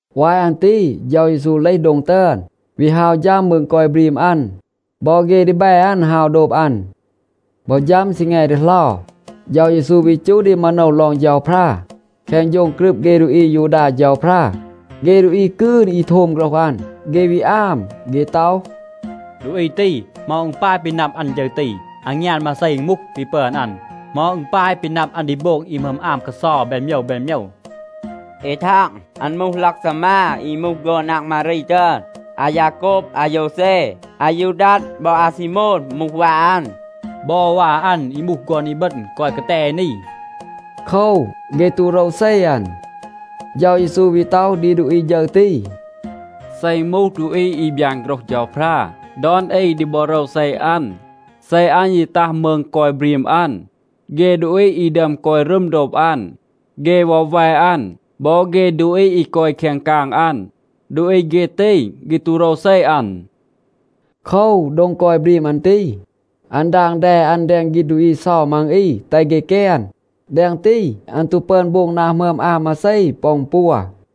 วาย อัน ตี เฌา เยซู เลห โดง ตึอน, วี ฮาว ฌัม มืง กอย บรีม อัน. บอ เฆ ดีแบ อัน ฮาว โดบ อัน. บอ ฌัม ซีแง ดีเหลา, เฌา เยซู วี จูห ดี มาโนว ลอง เฌาพรา แคง โฌง กรึบ เฆ ดูอี อายูดา เฌาพรา. เฆ ดูอี กืน อี โทม โฆรห อัน, เฆ วี อาม. เฆ ต็อห, “ดูอี ตี, เหมา อึณ ปาย ปี นับ อัน ฌึร ตี? อางยาน มาเซ อึณ มูห, ปี ปึอน อัน? เหมา อึณ ปาย ปี นับ อัน ดี โบง อี หมึอม อาม กาเซา แบน โมยว แบน โมยว? เอ ทาง, อัน มูห ลักซามา อี มูห ฆอน นาง มารี ตึอน. อายาโกบ, อาโยวเซ, อายูดัด บอ อาซีโมน มูห วา อัน. บอ วา อัน อี มูห ฆอน อีบึณ กอย กาแต เอ นี.” โคว, เฆ ตู โรวเซ อัน. เฌา เยซู วี ต็อห ดี ดูอี ฌึร ตี, “เซ อึณ มูห ดูอี อี บยาน โฆรห เฌาพรา, ดอน อี ดี บอ โรวเซ อัน. เซ อัน ยี ตัห มืง กอย บรีม อัน, เฆ ดูอี อี ดึอม กอย รึม โดบ อัน, เฆ วอแว อัน บอ เฆ ดูอี อี กอย แคง กาง อัน, ดูอี เฆ ตี, เฆ ตู โรวเซ อัน.” โคว, โดง กอย บรีม อัน ตี, อัน ดาง แด อัน แดง ฆีณ ดูอี เซา มัง อี, แตห เฆ แกน. แดง ตี, อัน ตู ปึอน โบง นา หมึอม อาม มาเซ ปอ อึณ ปัว.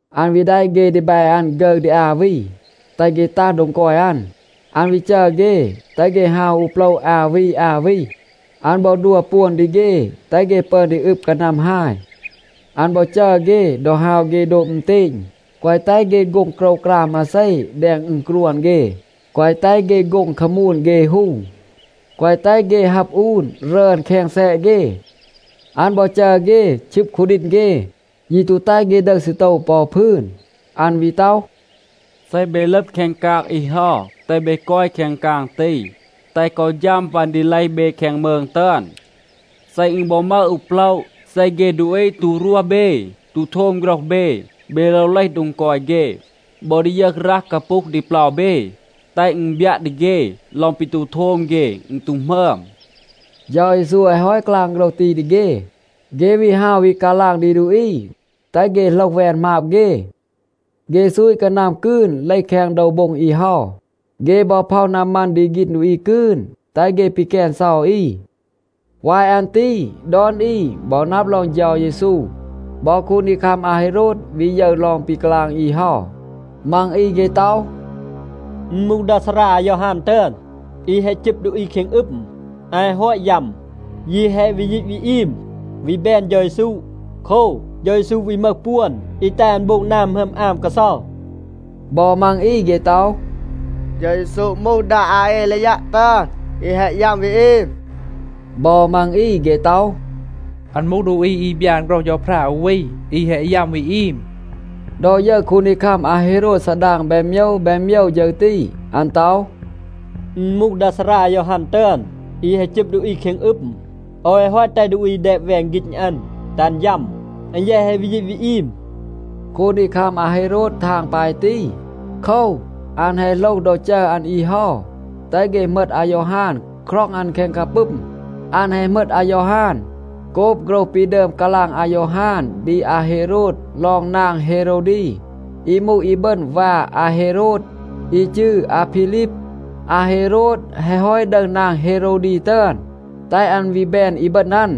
อัน วี แดะ เฆ ดีแบ อัน ฆึร ดี อา วี, แตห เฆ ตัห โดง กอย อัน. อัน วี จัร เฆ, แตห เฆ ฮาว อู โปละ อา วี อา วี. อัน บอ ดัว ปวน ดี เฆ, แตห เฆ ปึอน ดี อึบ กานัม ฮาย. อัน บอ จัร เฆ, ดอ ฮาว เฆ โดบ อึณเตณ, แกวะ แตห เฆ โฆ็ง โกรวกราม มาเซ แดง อึณกรวน เฆ. แกวะ แตห เฆ โฆ็ง คามูน เฆ ฮู. แกวะ แตห เฆ ฮับ อูน รึอน แคง แซะ เฆ. อัน บอ จัร เฆ ชึบ คูดีณ เฆ, ยี ตู แตห เฆ ดึห ซีโตว ปอ อู พืน. อัน วี ต็อห, “เซ เบ ลึบ แคง กาง อี เฮา, แตห เบ กอย แคง กาง ตี, แตห กอ ฌัม ปัน ดี เลห เบ แคง มืง ตึอน. เซ อึณ บอ มึห อู โปละ, เซ เฆ ดูอี ตู รวห เบ, ตู โทม โฆรห เบ, เบ โลว เลห โดง กอย เฆ บอ ดียึห รัห กาปูห ดี เปลา เบ, แตห อึณ บยัะ ดี เฆ ลอง ปี ตู โทม เฆ, อึณ ตู หมึอม.” เฌา เยซู แฮะ ฮอต กาลาง โฆรห ตี ดี เฆ, เฆ วี ฮาว วี กาลาง ดี ดูอี, แตห เฆ โหลห แวน หมาบ เฆ. เฆ ซูต กานัม กืน เลห แคง โดว โบ็ง อี เฮา. เฆ บอ พ็อห นามัน ดี ฆีณ ดูอี กืน, แตห เฆ ปีแกน เซา อี. วาย อัน ตี ดอน อี บอ นับ ลอง เฌา เยซู. บอ คูนดีคัม อาเฮโรด วี ยึร ลอง ปี กาลาง อี เฮา. มัง อี เฆ ต็อห, “อึณ มูห ดา ซารา อายอฮาน ตึอน, อี แฮะ จึบ ดูอี แคง อึม. อัน แฮะ ฮอต ยัม, ยี แฮะ วี ยีต วี อีม, วี แบน เฌา เยซู. โคว, เฌา เยซู วี มึห ปวน อี แตห อัน โบง นา หมึอม อาม กาเซา.” บอ มัง อี เฆ ต็อห, “เฌา เยซู มูห ดา อาเอลียัะ ตึอน, อี แฮะ ยัม วี อีม.” บอ มัง อี เฆ ต็อห, “อัน มูห ดูอี อี บยาน โฆรห เฌาพรา อู วี, อี แฮะ ยัม, วี อีม.” ดอ ยึร คูนดีคัม อาเฮโรด ซาดาง แบน โมยว แบน โมยว ฌึร ตี, อัน ต็อห, “อึณ มูห ดา ซารา อายอฮาน ตึอน, อี แฮะ จึบ ดูอี แคง อึม. โอว แฮะ ฮอต แตห ดูอี แดบ แวน ฆีณ อัน, แตห อัน ยัม. อัน แยะ แฮะ วี ยีต วี อีม.” คูนดีคัม อาเฮโรด ทาง ปาย ตี, โคว, อัน แฮะ โหลห ดอ จัร อัน อี เฮา, แตห เฆ เหมต อายอฮาน, คร็อง อัน แคง กาปึม. อัน แฮะ เหมต อายอฮาน, โกบ โฆรห ปี ดึอม กาลาง อายอฮาน ดี อาเฮโรด ลอง นาง เฮโรวดี, อี มูห อีบึณ วา อาเฮโรด, อี จืร อาพีลีบ. อาเฮโรด แฮะ ฮอต ดึห นาง เฮโรวดี ตึอน, แตห อัน วี แบน อีบึณ อัน.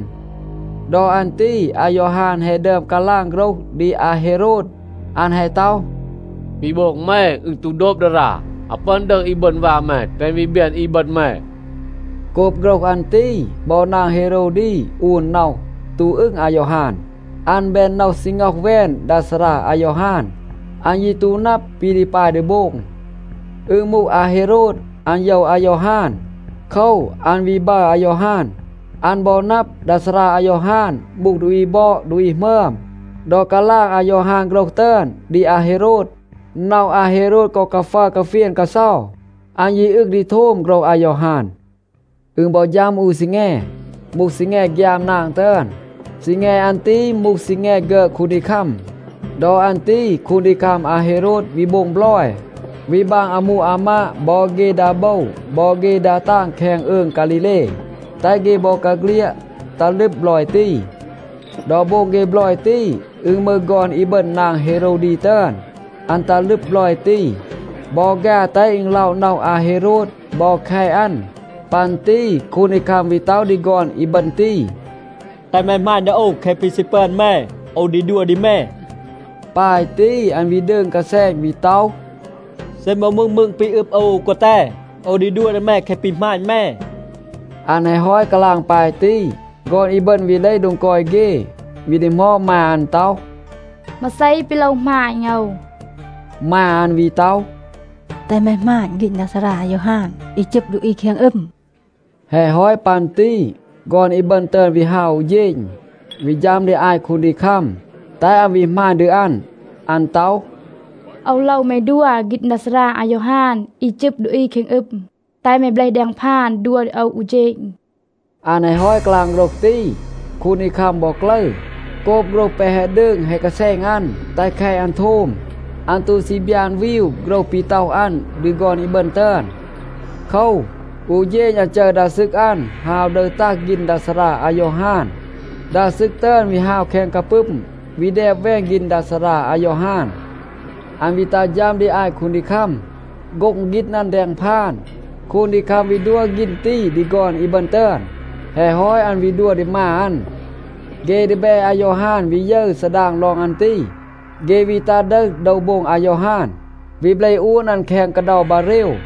ดอ อัน ตี อายอฮาน แฮะ ดึอม กาลาง โฆรห ดี อาเฮโรด. อัน แฮะ ต็อห, “ปี โบง แม, อึณ ตู โดบ ดารา. อาว ปึอน ดึห อีบึณ วา แม, แตห อัน วี แบน อีบึณ แม.” โกบ โฆรห อัน ตี, บอ นาง เฮโรวดี อูน น็อห, ตู อึง อายอฮาน. อัน แบน น็อห ซี ง็อห แวน ดา ซารา อายอฮาน. อัน ยี ตู นับ ปี ดี ปาย ดี โบง. อึณ มูห อาเฮโรด, อัน โยว อายอฮาน. โคว, อัน วี บัร อายอฮาน. อัน บอ นับ, ดา ซารา อายอฮาน มูห ดูอี บอด, ดูอี หมึอม. ดอ กาลาง อายอฮาน โฆรห ตึอน ดี อาเฮโรด, น็อห อาเฮโรด กอ กาฟัร กาเฟียน กาเซา. อัน ยี อึง ดี โทม โฆรห อายอฮาน. อึณ บอ ฌัม อู ซีแง, มูห ซีแง ฆยาม นาง ตึอน. ซีแง อัน ตี มูห ซีแง ฆึอด คูนดีคัม. ดอ อัน ตี คูนดีคัม อาเฮโรด วี โบง บลอย, วี บาง อามู อามาด บอ เฆ ดา โบว บอ เฆ ดา ตาง แคง อืง ฆาลีเล, แตห เฆ บอกาเฆลียด ตัห ลึบ บลอย ตี. ดอ โบง เฆ บลอย ตี, อึณ มึห ฆอน อีบึณ นาง เฮโรวดี ตึอน. อัน ตัห ลึบ บลอย ตี, บอ ฆา แตห อึณ ล็อะ น็อห อาเฮโรด บอ แคต อัน. ปัน ตี คูนดีคัม วี ต็อห ดี ฆอน อีบึณ ตี, “แตห แม หมาณ ดี โอว. แคะ ปี ซี ปึอน แม, โอว ดี ดัว ดี แม.” ปาย ตี, อัน วี ดืง กาแซณ, วี ต็อห, “เซ อึณ บอ มูห มืง ปี อึบ โอว อู กาแต, โอว ดี ดัว ดี แม แคะ ปี หมาณ แม.” อัน แฮะ ฮอต กาลาง ปาย ตี, ฆอน อีบึณ วี เลห โดง กอย เฆ, วี ดีหมอด มา อัน ต็อห, “มา เซ ปี โลว หมาณ โอว?” มา อัน วี ต็อห, “แตห แม หมาณ ฆีณ ดา ซารา อายอฮาน, อี จึบ ดูอี แคง อึม.” แฮะ ฮอต ปัน ตี ฆอน อีบึณ ตึอน วี ฮาว อู เฌณ, วี ฌัม ดี อาต คูนดีคัม, แตห อัน วี หมาณ ดี อัน. อัน ต็อห, “โอว โลว แม ดัว ฆีณ ดา ซารา อายอฮาน อี จึบ ดูอี แคง อึม. แตห แม เบลห แดง พาน, ดัว ดี โอว อู เฌณ.” อัน แฮะ ฮอต กาลาง โฆรห ตี, คูนดีคัม บอ กลึร. โกบ โฆรห แปะ แฮะ ดืง แฮะ กาแซณ อัน แตห แคต อัน โทม, อัน ตู ซี บยาน วีว โฆรห ปี ต็อห อัน ดี ฆอน อีบึณ ตึอน. โคว, อู เฌณ อัน จัร ดา ซึก อัน, ฮาว ดึห ตัห ฆีณ ดา ซารา อายอฮาน. ดา ซึก ตึอน วี ฮาว แคง กาปึม, วี แดบ แวน ฆีณ ดา ซารา อายอฮาน. อัน วี ตัห ฌัม ดี อาต คูนดีคัม, โฆ็ง ฆีณ อัน แดง พาน. คูนดีคัม วี ดัว ฆีณ ตี ดี ฆอน อีบึณ ตึอน. แฮะ ฮอต อัน วี ดัว ดี มา อัน. เฆ ดีแบ อายอฮาน วี ยึร ซาดาง ลอง อัน ตี, เฆ วี ตัห ดึห โดว โบ็ง อายอฮาน, วี เบลห อูน อัน แคง กาเดา บาเรว.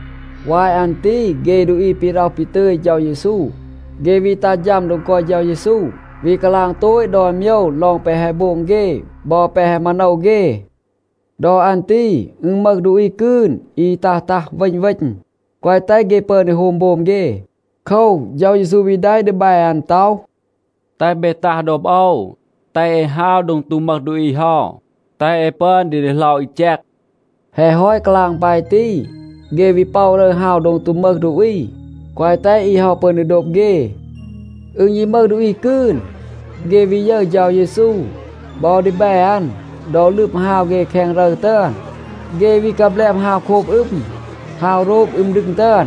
วาย อัน ตี เฆ ดูอี ปี ร็อห ปี ตึย เฌา เยซู, เฆ วี ตัห ฌัม โดง กอย เฌา เยซู, วี กาลาง โตต ดอน โมยว ลอง แปะ แฮะ โบง เฆ บอ แปะ แฮะ มาโนว เฆ. ดอ อัน ตี อึณ มึห ดูอี กืน อี ตัห ตัห, เวณ เวณ, แกวะ แตห เฆ ปึอน ดี โฮม โบม เฆ. โคว, เฌา เยซู วี แดะ ดีแบ อัน ต็อห, “แตห เบ ตัห โดบ โอว. แตห เอ ฮาว โดง ตู มึห ดูอี เฮา, แตห เอ ปึอน ดี ดีเหลา อี แจก.” แฮะ ฮอต กาลาง ปาย ตี, เฆ วี ป็อะ รึร ฮาว โดง ตู มึห ดูอี, แกวะ แตห อี เฮา ปึอน ดี โดบ เฆ. อึณ ยี มึห ดูอี กืน, เฆ วี ยึร เฌา เยซู บอ ดีแบ อัน ดอ ลึบ ฮาว เฆ แคง รึร ตึอน. เฆ วี กาแบลบ ฮาว โคบ อึม, ฮาว โรบ อึม ดึง ตึอน.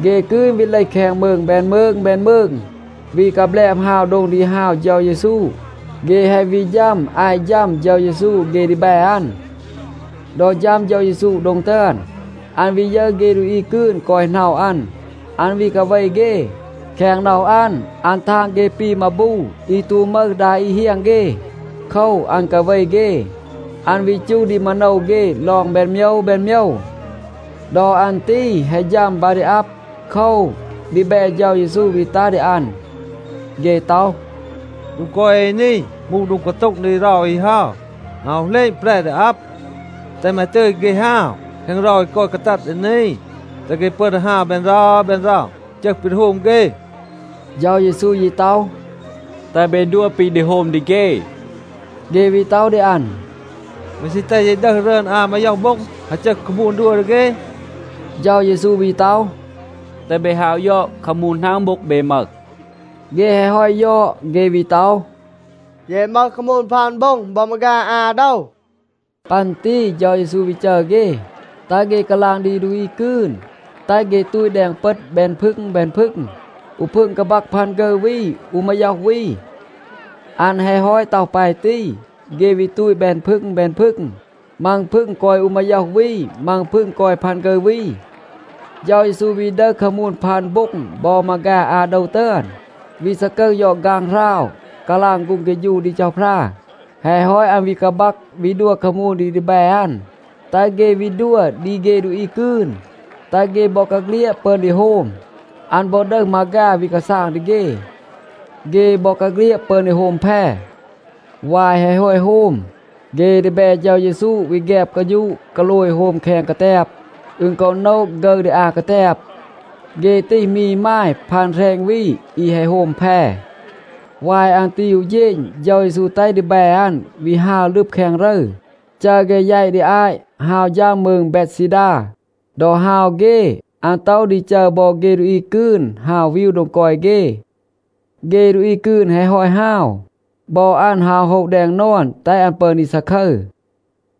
เฆ กืน วี เลห แคง มืง แบน มืง แบน มืง, วี กาแบลบ ฮาว โดง ดี ฮาว เฌา เยซู. เฆ แฮะ วี ฌัม อาต ฌัม เฌา เยซู เฆ ดีแบ อัน. ดอ ฌัม เฌา เยซู โดง ตึอน, อัน วี ยึร เฆ ดูอี กืน กอย หน็อะ อัน, อัน วี กาเว เฆ. แคง น็อห อัน, อัน ทาง เฆ ปี มาบู อี ตู มึห ดา อี เฮียง เฆ. โคว, อัน กาเว เฆ. อัน วี จูห ดี มาโนว เฆ ลอง แบน โมยว แบน โมยว. ดอ อัน ตี แฮะ ฌัม บา ดี อับ. โคว, ดีแบ เฌา เยซู วี ตัห ดี อัน. เฆ ต็อห, “โดง กอย เอ นี มูห โดง กาโต็ง ดี เรา อี เฮา. อาว เหลณ แปร ดี อับ. แตห แม ตึย เฆ ฮาว แคง เรา อี กอย กาตัด ดี นี, แตห เฆ ปึอน ดี ฮาว แบน เรา แบน เรา, จึห ปี ดี โฮม เฆ.” เฌา เยซู ยี ต็อห, “แตห เบ ดัว ปี ดี โฮม ดี เฆ.” เฆ วี ต็อห ดี อัน, “แม ซี แตห เย ดึห รึอน อา มาย็อห โบ็ง,a ฮาว จึห คามูน, ดัว ดี เฆ?” เฌา เยซู วี ต็อห, “แตห เบ ฮาว ยอด, คามูน หนาง โบ็ง เบ มึห?” เฆ แฮะ ฮอต ยอด, เฆ วี ต็อห, “เย มึห คามูน พัน โบ็ง บอ มาฆา อา โดว.” ปัน ตี เฌา เยซู วี จัร เฆ, แตห เฆ กาลาง ดี ดูอี กืน, แตห เฆ ตูต แดง เปต แบน พึง แบน พึง. อู พึง กาบัก พัน ฆึร วี, อู มาย็อห วี. อัน แฮะ ฮอต ต็อห ปาย ตี, เฆ วี ตูต แบน พึง แบน พึง. มัง พึง กอย อู มาย็อห วี, มัง พึง กอย พัน ฆึร วี. เฌา เยซู วี ดึห คามูน พัน โบ็ง บอ มาฆา อา โดว ตึอน, วี ซากึห ยอด ฆางหราว, กาลาง ฆูง เฆฌู ดี เฌาพรา. แฮะ ฮอต, อัน วี กาบัก วี ดัว คามูน ดี ดีแบ อัน, แตห เฆ วี ดัว ดี เฆ ดูอี กืน, แตห เฆ บอกาเฆลียด ปึอน ดี โฮม. อัน บอ ดึห มาฆา วี กาซาง ดี เฆ. เฆ บอกาเฆลียด ปึอน ดี โฮม แพ. วาย แฮะ ฮอต โฮม, เฆ ดีแบ เฌา เยซู วี แฆบ กาฌูะ กาโลย โฮม แคง กาแตบ. อึณ กอ โนะ ฆึร ดี อา กาแตบ. เฆ ตีห มี อีมาย พัน แหรณ วี, อี แฮะ โฮม แพ. วาย อัน ตี อู เฌณ, เฌา เยซู แตห ดีแบ อัน วี ฮาว ลึบ แคง รึร, จัร เฆ แยต ดี อาต, ฮาว ฌัม มืง เบดซีดา. ดอ ฮาว เฆ, อัน ต็อห ดี จัร บอ เฆ ดูอี กืน ฮาว วีว โดง กอย เฆ. เฆ ดูอี กืน แฮะ ฮอต ฮาว, บอ อัน ฮาว โฮะ แดง นอน, แตห อัน ปึอน ดี ซาคึร.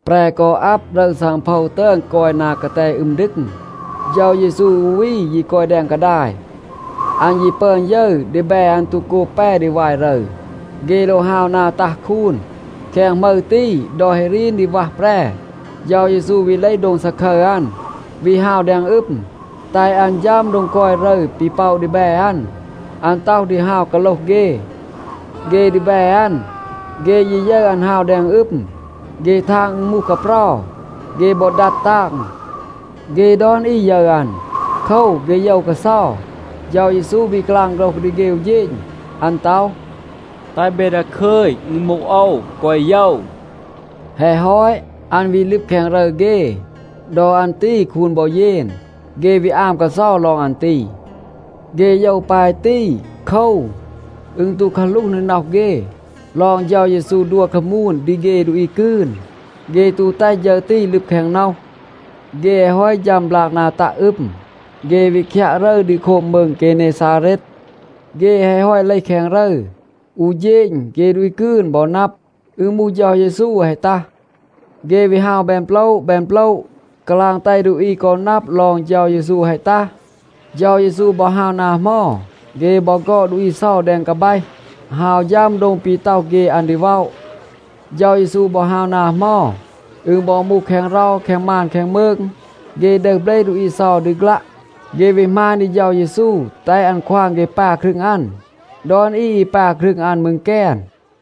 แปร กอ อับ, รึร ซังโพว ตึอน กอย นา กาแต อึม ดึง. เฌา เยซู อู วี ยี กอย แดง กาดาย. อัน ยี ปึอน ยึร, ดีแบ อัน ตู โกบ แป ดี วาย รึร. เฆ โลว ฮาว นา ตัห คูน. แคง หมึร ตี, ดอ แฮะ รีน ดี วัห แปร, เฌา เยซู วี เลห โดง ซาคึร อัน, วี ฮาว แดง อึม, แตห อัน ฌัม โดง กอย รึร ปี ป็อะ ดีแบ อัน. อัน ต็อห ดี ฮาว กาโลห เฆ. เฆ ดีแบ อัน, เฆ ยี ยึร อัน ฮาว แดง อึม, เฆ ทาง อึณ มูห กาเปรา. เฆ บอ ดัด ตาง. เฆ ดอน อี ยึร อัน. โคว, เฆ โยว กาเซา. เฌา เยซู วี กาลาง โฆรห ดี เฆ อู เฌณ. อัน ต็อห, “แตห เบ ดาคึย, อึณ มูห โอว. แกวะ โยว.” แฮะ ฮอต, อัน วี ลึบ แคง รึร เฆ. ดอ อัน ตี คูน บอ เยน. เฆ วี อาม กาเซา ลอง อัน ตี. เฆ โยว ปาย ตี โคว, อึณ ตู กาหลูห ดี น็อห เฆ ลอง เฌา เยซู ดัว คามูน ดี เฆ ดูอี กืน. เฆ ตู แตห ฌึร ตี ลึบ แคง น็อห. เฆ แฮะ ฮอต ฌัม บลาก นา ตัะ อึม, เฆ วี คยัะ รึร ดี โคบ มืง เกเนซาเรด. เฆ แฮะ ฮอต เลห แคง รึร, อู เฌณ, เฆ ดูอี กืน บอ นับ, อึณ มูห เฌา เยซู แฮะ ตัห. เฆ วี ฮาว แบน โปละ แบน โปละ, กาลาง แตห ดูอี กอ นับ ลอง เฌา เยซู แฮะ ตัห. เฌา เยซู บอ ฮาว นา เหมา, เฆ บอ ฆอด ดูอี เซา แดง กาแบห, ฮาว ฌัม โดง ปี ต็อห เฆ อัน ดี ว็อะ. เฌา เยซู บอ ฮาว นา เหมา, อึณ บอ มูห แคง เรา, แคง มาน แคง มืง, เฆ ดึห เบลห ดูอี เซา ดี ฆลัะ. เฆ วี หมาณ ดี เฌา เยซู, แตห อัน ควาง เฆ ปา ครึง อัน. ดอน อี อี ปา ครึง อัน มืร แกน.